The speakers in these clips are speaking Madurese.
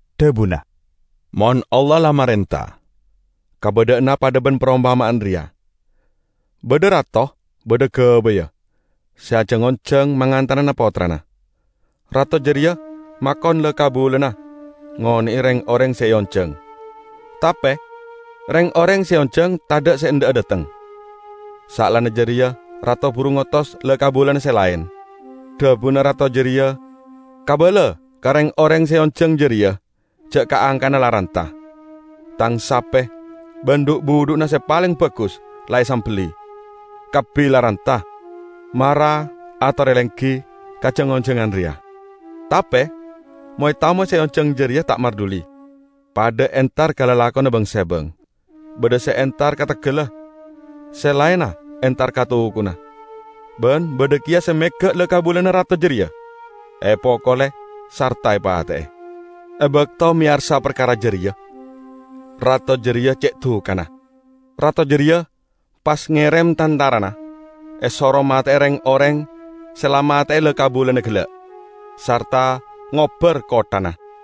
dhabuna, "Mon Allah la marenta, kabadha'anna padha ban parompama'an reya: Badha rato badha gabayya, se ajang-onjang mangantanana pottrana. Rato jareya makon la-kabulana ngone'e reng-oreng se eonjang. Tape reng-oreng se eonjang tadha' se endha'a dhateng. Saellana jareya rato buru ngotos la-kabulana se laen. Dhabuna rato jareya 'Kabala ka reng-oreng se eonjang jareya ja' ka'-angka'na la ranta. Tang Sape ban dhu'-budhu'na se paleng bagus la esambelli. Kabbi la ranta. Mara atore lenggi ka jang-onjangan reya!' Tape moy-tamoy se eonjang jareya ta' marduli, padha entar ka lalakonna bang-sebang: badha se entar ka teggalla, se laenna entar ka tokona; ban badha keya se mega' la-kabulana rato jareya, epokole sarta epate'e. E bakto meyarsa parkara jareya, rato jareya ce' dukana. Rato jareya pas ngerem tantarana esoro mate'e reng-oreng se la mate'e la-kabulana gella', sarta ngobbar kotthana.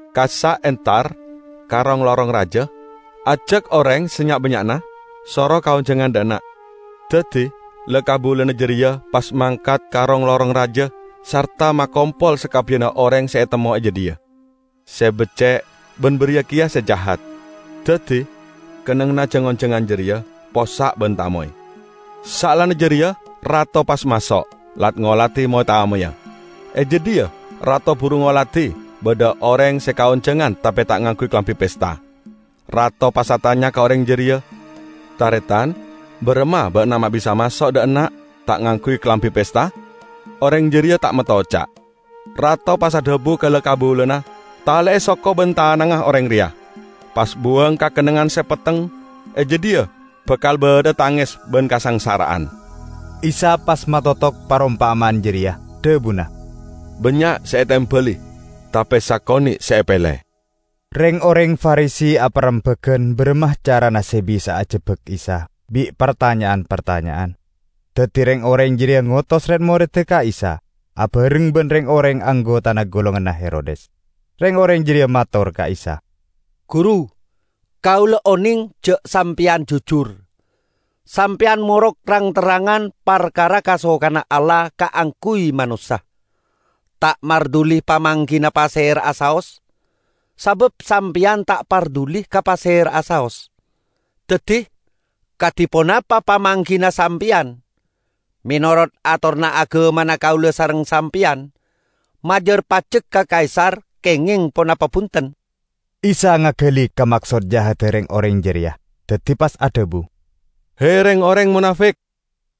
Kassa' entar ka rong-lorong raja, ajak oreng sanya'-bannya'na, soro kaonjangan dha' enna'.' Daddi la-kabulana jareya pas mangkat ka rong-lorong raja sarta makompol sakabbiyanna oreng se etemmo e jadhiya, se becce' ban bariya keya se jahat. Daddi kennengnganna jang-onjangan jareya possa' ban tamoy. Saellana jareya rato pas maso', lat-ngoladi moy-tamoyya. E jadhiya rato buru ngoladi badha oreng se kaonjangan tape ta' ngangguy kalambi pesta. Rato pas atanya ka oreng jareya, 'Taretan, baramma ba'na ma' bisa maso' dha' enna' ta' ngangguy kalambi pesta?' Oreng jareya ta' metto oca'. Rato pas adhabu ka la-kabulana, 'Tale'e soko ban tanangnga oreng reya, pas buwang ka kennengngan se petteng. E jadhiya bakal badha'a tanges ban kasangsara'an.' " Isa pas matotok parompama'an jareya, dhabuna, "Bannya' se etembali, tape sakone' se epele." Reng-oreng Farisi aparembagan baramma carana se bisa'a ajebbak Isa bi' partanya'an-partanya'an. Daddi reng-oreng jareya ngotos red-moredda ka Isa abareng ban reng-oreng anggotana golonganna Herodes. Reng-oreng jareya mator ka Isa, "Guru, kaula oneng ja' Sampeyan jujur. Sampeyan morok rang-terrangan parkara kasokanna Allah kaangguy manossa, ta' marduli pamanggina pasera'a saos, sabab Sampeyan ta' parduli ka pasera'a saos. Daddi, kadi ponapa pamanggina Sampeyan? Menorot atoranna agamana kaula sareng Sampeyan, majar pajek ka Kaisar kengeng ponapa bunten?" Isa ngagali ka maksod jahadda reng-oreng jareya, daddi pas adhabu, "He, reng-oreng monafik!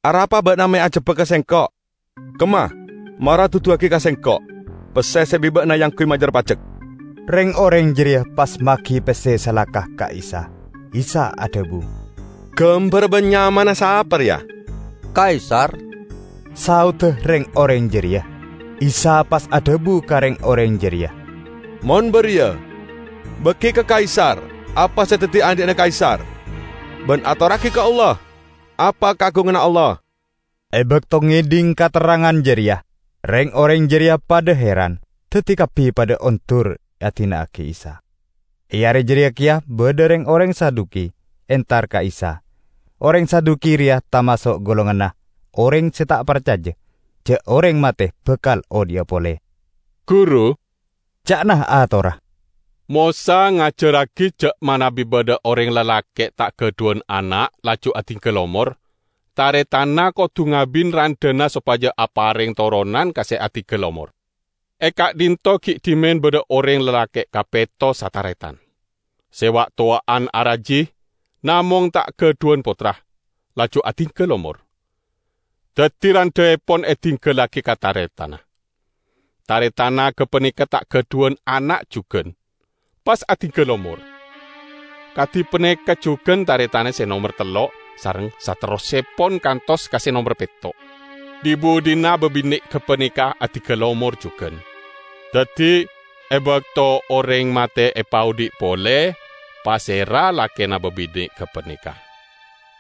Arapa ba'na me' ajebbaga Sengko'? Kemma mara duduwagi ka Sengko' pesse se bi' ba'na eangguy majar pajek!" Reng-oreng jareya pas magi pesse salaka ka Isa. Isa adhabu, "Gambarra ban nyamana sapa reya?" "Kaisar," saodda reng-oreng jareya. Isa pas adhabu ka reng-oreng jareya, "Mon bariya, bagi ka Kaisar apa se daddi andhi'na Kaisar, ban atorragi ka Allah apa kaagunganna Allah." E bakto ngedhing katerrangan jareya, reng-oreng jareya padha heran. Daddi kabbi padha ondur adina'agi Isa. E are jareya keya badha reng-oreng Saduki entar ka Isa. Oreng Saduki reya tamaso' golonganna oreng se ta' parcaja ja' oreng mate bakal odhi'a pole. "Guru," ca'na atorra, "Mosa ngajarragi ja' manabi badha oreng lalake' ta' gadhuwan ana' laju adinggal omor, taretanna kodu ngabin randhana sopaja apareng toronan ka se adinggal omor. E ka'dhinto' gi' dhimen badha oreng lalake' kapetto sataretan. Se wa'-towa'an araji, namong ta' gadhuwan pottra, laju adinggal omor. Daddi randhaepon edinggallagi ka taretanna. Taretanna gapaneka ta' gadhuwan ana' jugan, pas adinggal omor. Kadi paneka jugan taretanna se nomer tello' sareng saterrossepon kantos ka se nomer petto'. Dhi-budhina babine' gapaneka adinggal omor jugan. Daddi, e bakto oreng mate epaodhi' pole, pasera lakena babine' gapaneka?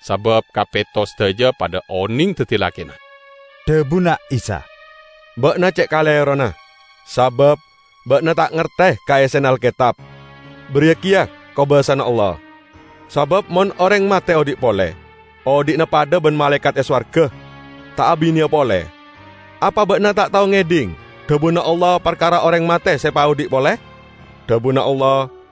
Sabab kapetto sadaja padha oneng daddi lakena." Dhabuna Isa, "Ba'na ce' kalerona, sabab ba'na ta' ngarte ka essena Alketab, bariya keya kobasana Allah. Sabab mon oreng mate odhi' pole, odhi'na padha ban malaekat e sowarga, ta' abineya pole. Apa ba'na ta' tao ngedhing dhabuna Allah parkara oreng mate se epaodhi' pole? Dhabuna Allah,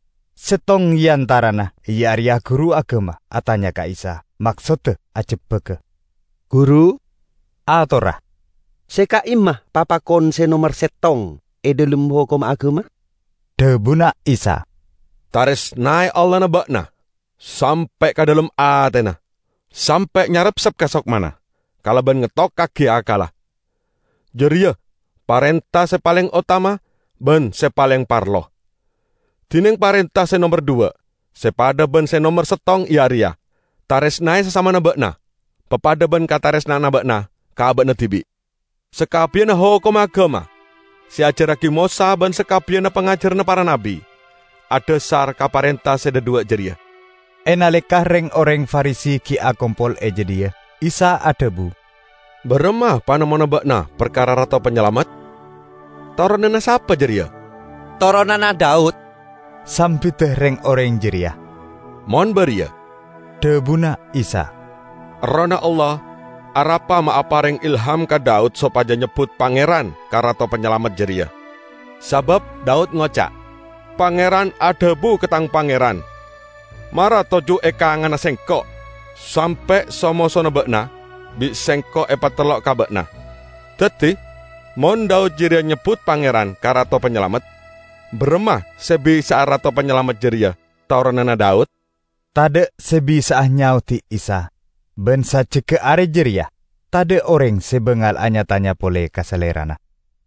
Settong e antarana, iya areya guru agama, atanya ka Isa, maksodda ajebbaga. "Guru," atorra, "se ka'imma papakon se nomer settong e dhalem hokomma agama?" Dhabuna Isa, "Taresnae Allahna ba'na sampe' ka dhalem atena, sampe' nyarepsep ka sokmana, kalaban ngettokkagi akkalla. Jareya parenta se paleng otama ban se paleng parlo! Dineng parenta se nomer dhuwa' se padha ban se nomer settong iya areya: Taresnae sasamana ba'na papadha ban kataresna'anna ba'na ka aba'na dibi'. Sakabbiyanna hokomma agama se eajarragi Mosa ban sakabbiyanna pangajaranna para nabbi adhasar ka parenta se dhadhuwa' jareya." E naleka reng-oreng Farisi gi' akompol e jadhiya, Isa adhabu, "Baramma panemmona ba'na parkara Rato Panyalamet? Toronanna sapa jareya?" "Toronanna Daud," sambidda reng-oreng jareya. "Mon bariya," dhabuna Isa, "Errohna Allah arapa ma' apareng ilham ka Daud sopaja nyebbut 'Pangeran' ka Rato Panyalamet jareya? Sabab Daud ngoca', 'Pangeran adhabu ka tang Pangeran: Mara toju' e kanganna Sengko', sampe' so-mosona ba'na bi' Sengko' epatellok ka ba'na.' Daddi mon Daud jareya nyebbut 'Pangeran' ka Rato Panyalamet, baramma se bisa'a Rato Panyalamet jareya toronanna Daud?" Tadha' se bisa'a nyaodi Isa. Ban sajjegga are jareya, tadha' oreng se bangal anya-tanya pole ka Salerana.